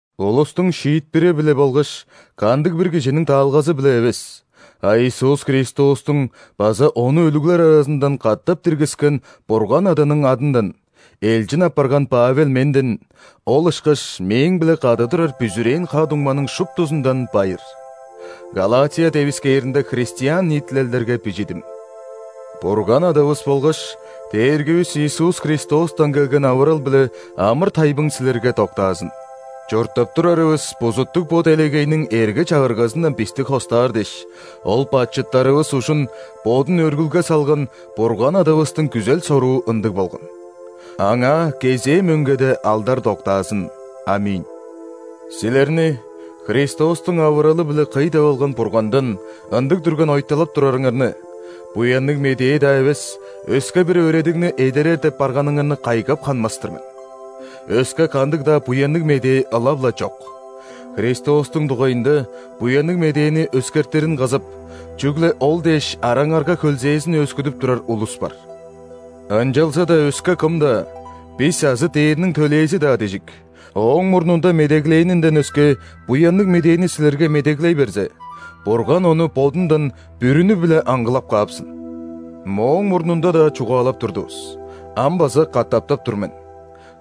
Улустуң шиитпири-биле болгаш кандыг-бир кижиниң даалгазы-биле эвес, а Иисус Христостуң база Ону өлүглер аразындан катап диргискен Бурган Аданың адындан элчин апарган Павел менден, ол ышкаш мээң-биле кады турар бүзүрээн ха-дуңманың шуптузундан байыр! Галатия девискээринде христиан ниитилелдерге бижидим. Бурган Адавыс болгаш Дээргивис Иисус Христостан келген авырал биле амыр-тайбың силерге доктаазын. Чурттап турарывыс бузуттуг бо делегейниң эрге-чагыргазындан бисти хостаар дээш, Ол бачыттарывыс ужун Бодун өргүлге салган Бурган Адавыстың күзел-соруу ындыг болган. Аңаа кезээ мөңгеде алдар доктаазын. ·Аминь. Силерни Христостуң авыралы-биле кый деп алган Бургандан ындыг дүрген ойталап турарыңарны, Буянныг Медээ-даа эвес өске-бир өөредигни эдерер деп барганыңарны кайгап ханмас-тыр мен. Өске кандыг-даа Буянныг Медээ ылап-ла чок! Христостуң дугайында Буянныг Медээни өскертирин кызып, чүгле ол дээш араңарга хөлзээзин өөскүдүп турар улус бар. Ынчалза-даа өске кым-даа, бис азы ·дээрниң төлээзи-даа дижик, ооң мурнунда медеглээнинден өске Буянныг Медээни силерге медеглей берзе, Бурган ону Бодундан бүрүнү-биле аңгылап каапсын! Мооң мурнунда-даа чугаалап турдувус, ам база катаптап тур мен: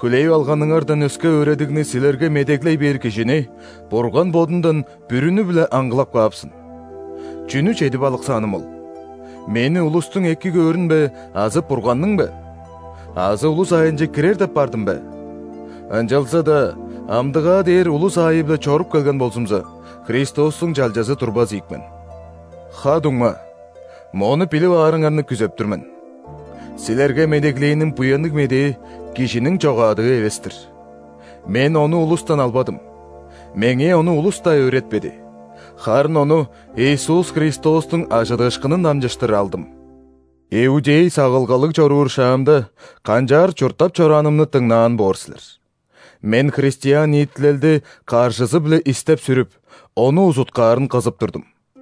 хүлээп алганыңардан өске өөредигни силерге медеглей бээр кижини Бурган Бодундан бүрүнү-биле аңгылап каапсын! Чүнү чедип алыксааным ол: мени улустуң эки көөрүн бе азы Бурганның бе? Азы улус аайынче кирер деп бардым бе? Ынчалза-даа амдыгаа дээр улус аайы-биле чоруп келген болзумза, Христостуң чалчазы турбас ийик мен. Ха-дуңма, мону билип аарыңарны күзеп тур мен: силерге медеглээним Буянныг Медээ – кижиниң чогаадыы эвес-тир. Мен ону улустан албадым, меңээ ону улус-даа өөретпеди, харын ону Иисус Христостуң ·ажыдыышкынын дамчыштыр алдым! Иудей сагылгалыг чоруур шаамда, канчаар чурттап чораанымны дыңнаан боор силер. Мен христиан ниитилелди каржызы-биле истеп-сүрүп, ону узуткаарын кызып турдум.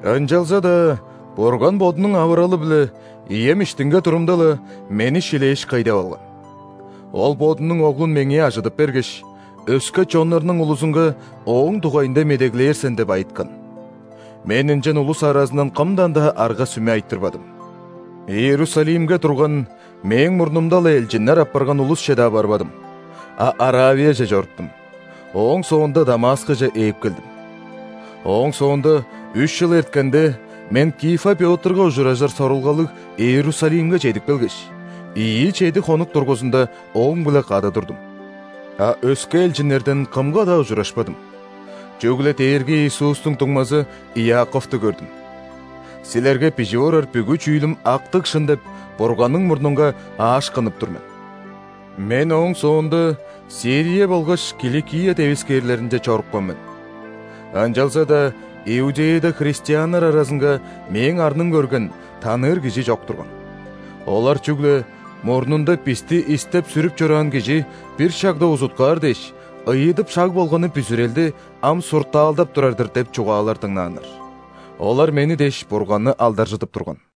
Ынчалза-даа Бурган Бодунуң авыралы-биле ием иштинге турумда-ла, мени шилээш, кый деп алган. Ол, Бодунуң Оглун меңээ ажыдып бергеш, «Өске чоннарның улузунга Ооң дугайында медеглээр сен» деп айыткан. Мен ынчан улус аразындан кымдан-даа арга-сүме айтырбадым. Иерусалимге турган, мээң мурнумда-ла элчиннер апарган улусче-даа барбадым, а Аравияже чоруптум, ооң соонда Дамаскыже ээп келдим. Ооң соонда, үш чыл эрткенде, мен Кифа Пётрга ужуражыр сорулгалыг Иерусалимге чедип келгеш, ийи чеди хонук дургузунда ооң-биле кады турдум. А өске элчиннерден кымга-даа ужурашпадым, чүгле Дээрги Иисустуң дуңмазы Иаковту көрдүм. Силерге бижип орар бүгү чүүлүм актыг шын деп, Бурганның мурнунга аашкынып тур мен! Мен ооң соонда Сирия болгаш Киликия девискээрлеринче чорупкан мен. Ынчалза-даа Иудеяда христианнар аразынга мээң арным көрген, таныыр кижи чок турган. Олар чүгле: «Мурнунда бисти истеп-сүрүп чораан кижи бир шагда узуткаар дээш, ыйыдып шаг болганы бүзүрелди ам суртаалдап турар-дыр» – деп чугаалар дыңнааннар. Олар мени дээш Бурганны алдаржыдып турган.